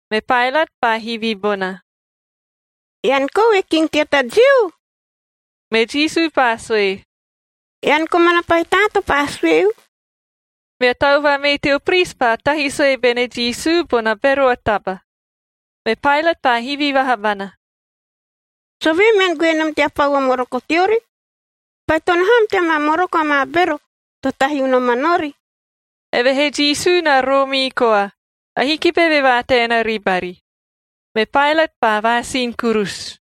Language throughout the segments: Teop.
Me Paelat paa hivi bona, “Ean kou e king tea ta Jiu?” Me Jisu paa sue, “Ean komana pahi taa to paa sueu.” Mea tau vamee teo pris paa tahi sue bene Jisu bona bero a taba. Me Paelat paa hivi vaha bana, “Sovee mean goe nom tea pau o moroko teori? Baitono ham tea maa moroko amaa bero to tahi unoman ori.” Evehee Jisu na roomii koa, ahiki beve vaataena ribari. Me Paelat paa vaasin kurusu.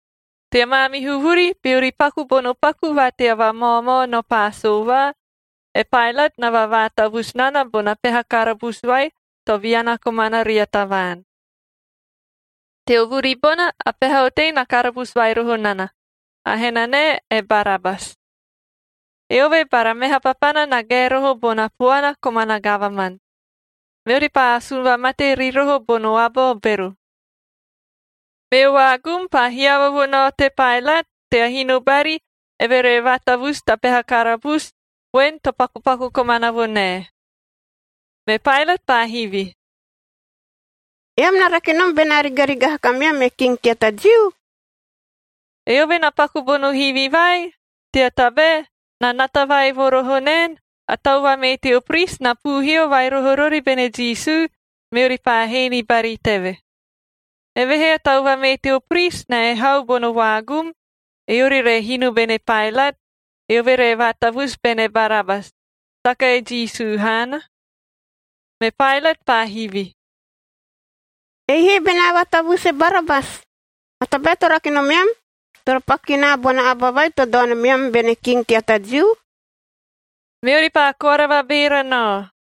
Tea maamihu vuri, beori paku bono paku va tea vamaomao no Paasova, e Paelat na vavaatavusu nana bona peha karabusu vai to viana komana ria tavaan. Teo vuri bona a peha otei na karabusu vai roho nana, a henanae e Barabas. Eove bara meha papana na gae roho bona puana komana gavaman, meori paa asun vamate ri roho bono aba o bero. Meo vaagum paa hiava vo nao te Paelat tea hino bari, eve re vaatavusu ta peha karabusu voen to pakupaku komana vo nae. Me Paelat paa hivi, “Eam na rake nom benaa rigarigaha kameam e king tea ta Jiu?” Eove na paku bono hivi vai, tea tabae na nata vai vo roho naen, a tau vamee teo pris na puuhio vai roho rori bene Jisu, meori paa hee ni bari teve. Evehee a tau vamee teo pris na ehau bono vaagum, eori re hino bene Paelat, eove re vaatavusu bene Barabas, saka e Jisu haana. Me Paelat paa hivi, “Ei he benaa vaatavusu e Barabas, a tabae to rake nomeam toro paku ki naa bona aba vai to dao nomeam bene king tea ta Jiu?” Meori paa koara vabeera nao,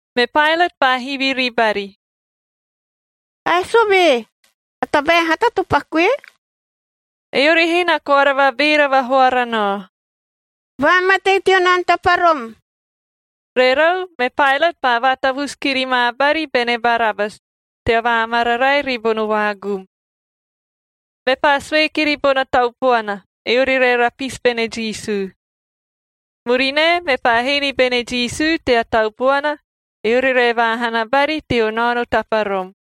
Me Paelat paa hivi ribari, “Ae sovee? A tabae a hata to pakue?” Eori he na koara vabeera vahoara nao, “Vaamatei teo naono taparom!” Rerau, me Paelat paa vaatavusu kiri ma bari bene Barabas tea vaamararae ribono vaagum. Mepaa sue kiri bona tau puana, eori re rapisib bene Jisu. Murinae, mepaa hee ni bene Jisu tea tau puana, eori re vaahana bari teo naono taparom.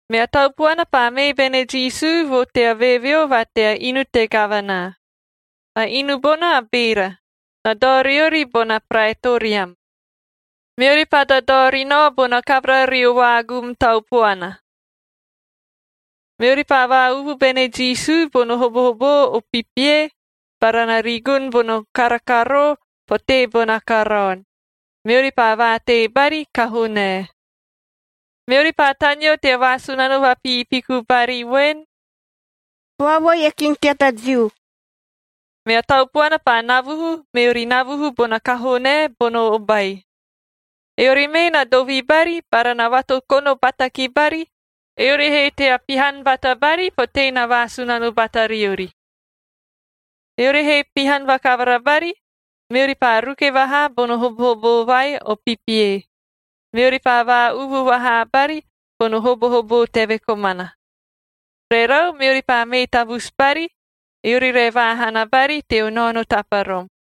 Mea tau puana paa mee bene Jisu vo tea veeveo va tea inu te gavana. A inu bona a beera, na dao riori bona Praetoriam. Meori paa dadao ri nao bona kavara rio vaagum tau puana. Meori paa vaa-uvu bene Jisu bono hobohoboo o pipie,c bara na rigun bono kara karoo potee bono karaon, meori paa vaatei bari kahoo nae. Meori paa taneo tea vaasunano vapiipiku bari voen, “Vaovoi e king tea ta Jiu!” Mea tau puana paa navuhu, meori navuhu bona kahoo nae bono obai. Eori mee na dovi bari bara na vatokono bata ki bari, eori he tea pihan bata bari potee na vaasunano bata riori. Eori he pihan vakavara bari, meori paa ruke vahaa bono hobohoboo vai o pipie, meori paa vaa-uvu vaha bari bono hobohoboo teve komana. Rerau, meori paa mee tavusu bari, eori re vaahana bari teo naono taparom.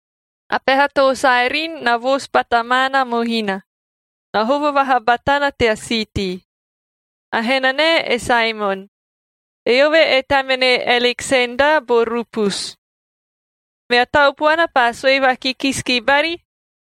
A peha too Saerin na voosu bata maana mohina, na hovo vaha batana tea siitii. A henanae e Saemon, eove e tamene Aleksenda bo Rupus. Mea tau puana paa sue vakikisi ki bari,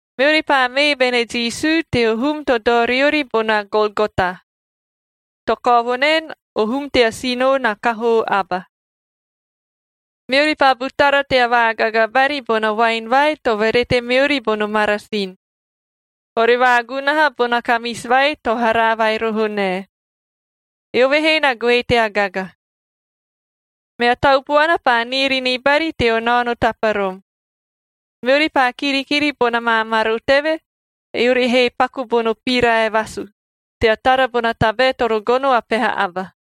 Meori paa mee bene Jisu teo hum to dao riori bona Golgota (to kao vo naen, ‘O Hum tea Sinoo na Kahoo Aba’). Meori paa butara tea vaagaga bari bona voaen vai to verete meori bono marasin, ore vaagunaha bona kamisi vai to haraa vai roho nae.e Eove he na goe tea gaga. Mea tau puana paa niiri ni bari teo naono taparom. Meori paa kirikiri bona maa maro teve, eori he paku bono pirae vasuf tea tara bona tabae toro gono a peha aba.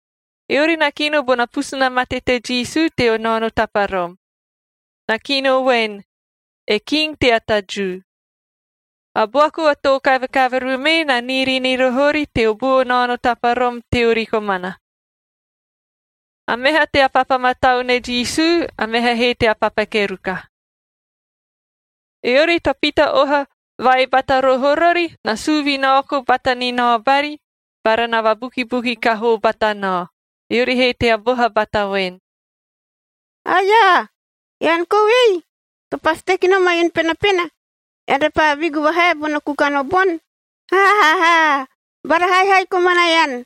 Eori na kino ni bona pusu na mate te Jisu teo naono taparom. Na kino voen, “E king tea ta Jiu.” A buaku a too kavekaveru mee na niiri ri roho ori teo buo naono taparom teori komana. A meha tea papa matau ne Jisu, a meha he tea papa keruka. g Eori to pita oha vai bata roho rori, na suu vinaoku bata ni nao bari bara na vabukibuki kahoo bata nao, eori he tea boha bata voen, “Aia! Ean kou ei, to pasi teki nom a inu penapena, ean repaa vigu vahae bono kukan o boni! Ha ha! Bara haihai komana ean!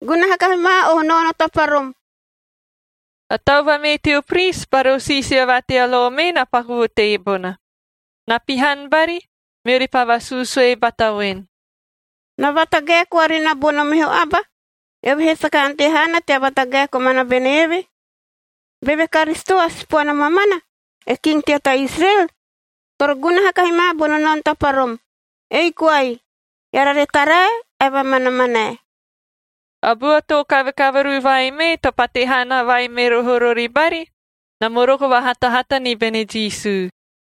Gunaha kahi ma o naono taparom!” A tau vamee teo pris bara o siisia va tea lo mee na paku vo teebona. Na pihan bari, meori paa vasuusue bata voen, “Na vatagae koa ri na bono meho aba, eove he saka ante haana tea vatagae komana bene eve. Beve Karisito a Sipoana mamana, e king tea ta Israel, toro gunaha kahi ma bono naono taparom, ei koai, eara re tarae ae vamanamanae.” A bua too kavekaveru vai mee to pate hana vai me roho rori bari, na moroko vahatahata ni bene Jisu.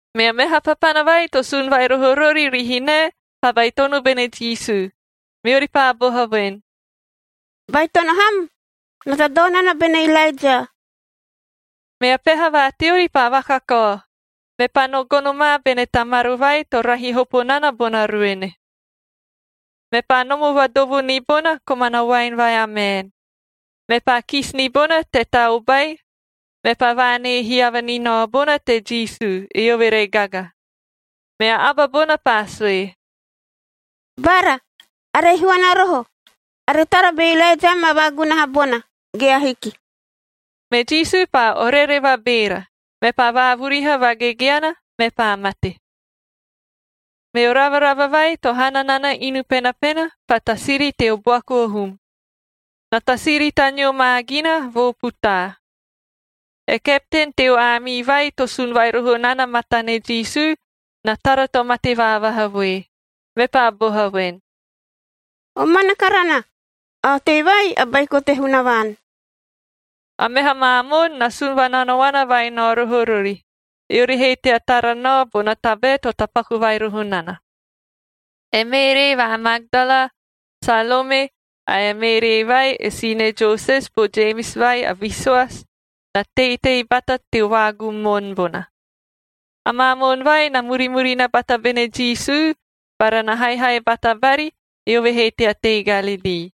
Mea meha papana vai to sun vai roho rori rihinae paa baitono bene Jisu, meori paa boha voen, “Baitono ham! Na dadao nana bene Ilaeja.” Mea peha va teori paa vakakao, mepaa no gono ma bene ta maro vai to rahi hopo nana bona ruene. Mepaa nomo vadovo ni bona komana voaen vai a maen, mepaa kisi ni bona te ta obai, mepaa vaanee hiava ni nao bona te Jisu, eove re gaga. Mea aba bona paa sue, “Bara, are ihuana roho. Are tara be Ilaeja ma vaagunaha bona, ge ahiki.” Me Jisu paa orere vabeera, mepaa vaavuriha vagegeana, mepaa mate. Meo ravarava vai to hana nana inu penapena paa tasiri teo buaku o hum. Na tasiri taneo ma gina vo putaa. E kepten teo aamii vai to sun vai roho nana matane Jisu na tara to mate vaavaha voe, mepaa boha voen, “Omana karana, a otei vai a Baiko te Hunavaan!” A meha maa moon na sun vananaona vai nao roho rori, eori he tea tara nao bona tabae to tapaku vai roho nana. E Meeree va Magdala, Salome ae e Meeree vai e sine Joses bo Jemis vai a visoasi, na teitei bata teo vaagum moon bona. Amaa moon vai na murimurina bata bene Jisu bara na haihai bata bari, eove he tea tei Galilii.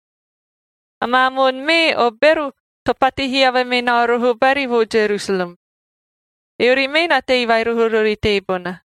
Amaa moon mee o bero to pate hiava me nao roho bari vo Jerusalem. Eori mee na tei vai roho rori teebona.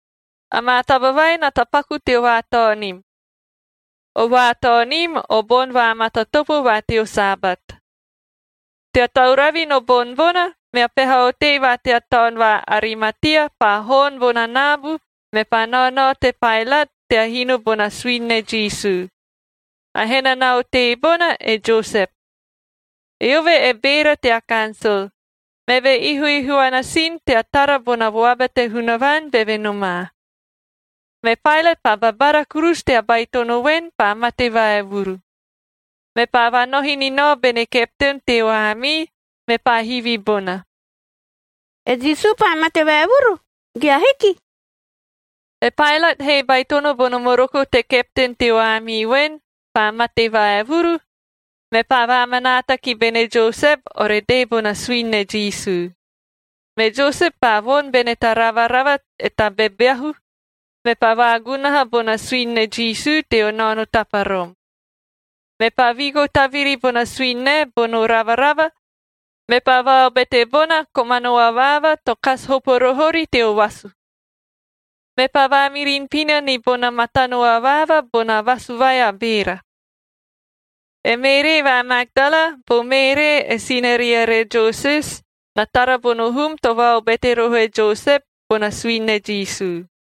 Amaa taba vai na tapaku teo vaataonim. O vaataonim o Boni Vaamatatopo va teo Sabat. Tea tauravi no boni bona, mea peha otei va tea taon va Arimatia, paa hoon nao bona naabu, mepaa naonao te Paelat tea hino bona suini ne Jisu.j A henana otei bona, e Josep. Eove e beera tea kansol, meve na ihuihuana sin tea tara bona vuaba te Hunavaan, beve nomaa. Me Paelat paa babara kurusu tea baitono voen, paa mate vaevuru. Mepaa vaanohi ni nao bene kepten teo aamii, mepaa hivi bona, “E Jisu paa mate vaevuru ge ahiki?” E Paelat he baitono bono moroko te kepten teo aamii voen, paa mate vaevuru, meve paa vaamanaata ki bene Josep ore dee bona suini ne Jisu. Me Josep paa voni bene ta ravarava e ta bebeahu,k meve paa vaagunaha bona suini ne Jisu teo naono taparom. Mepaa vigo taviri bona suini nae bono ravarava, mepaa vaobete bona, komano avaava to kasi hopo roho ori teo vasu. Mepaa vaamirin pina ni bona matano avaava bona vasu vai a beera. E Meeree va Magdala bo Meeree e sinariere Joses na tara bono hum to vaobete roho e Josep bona suini ne Jisu.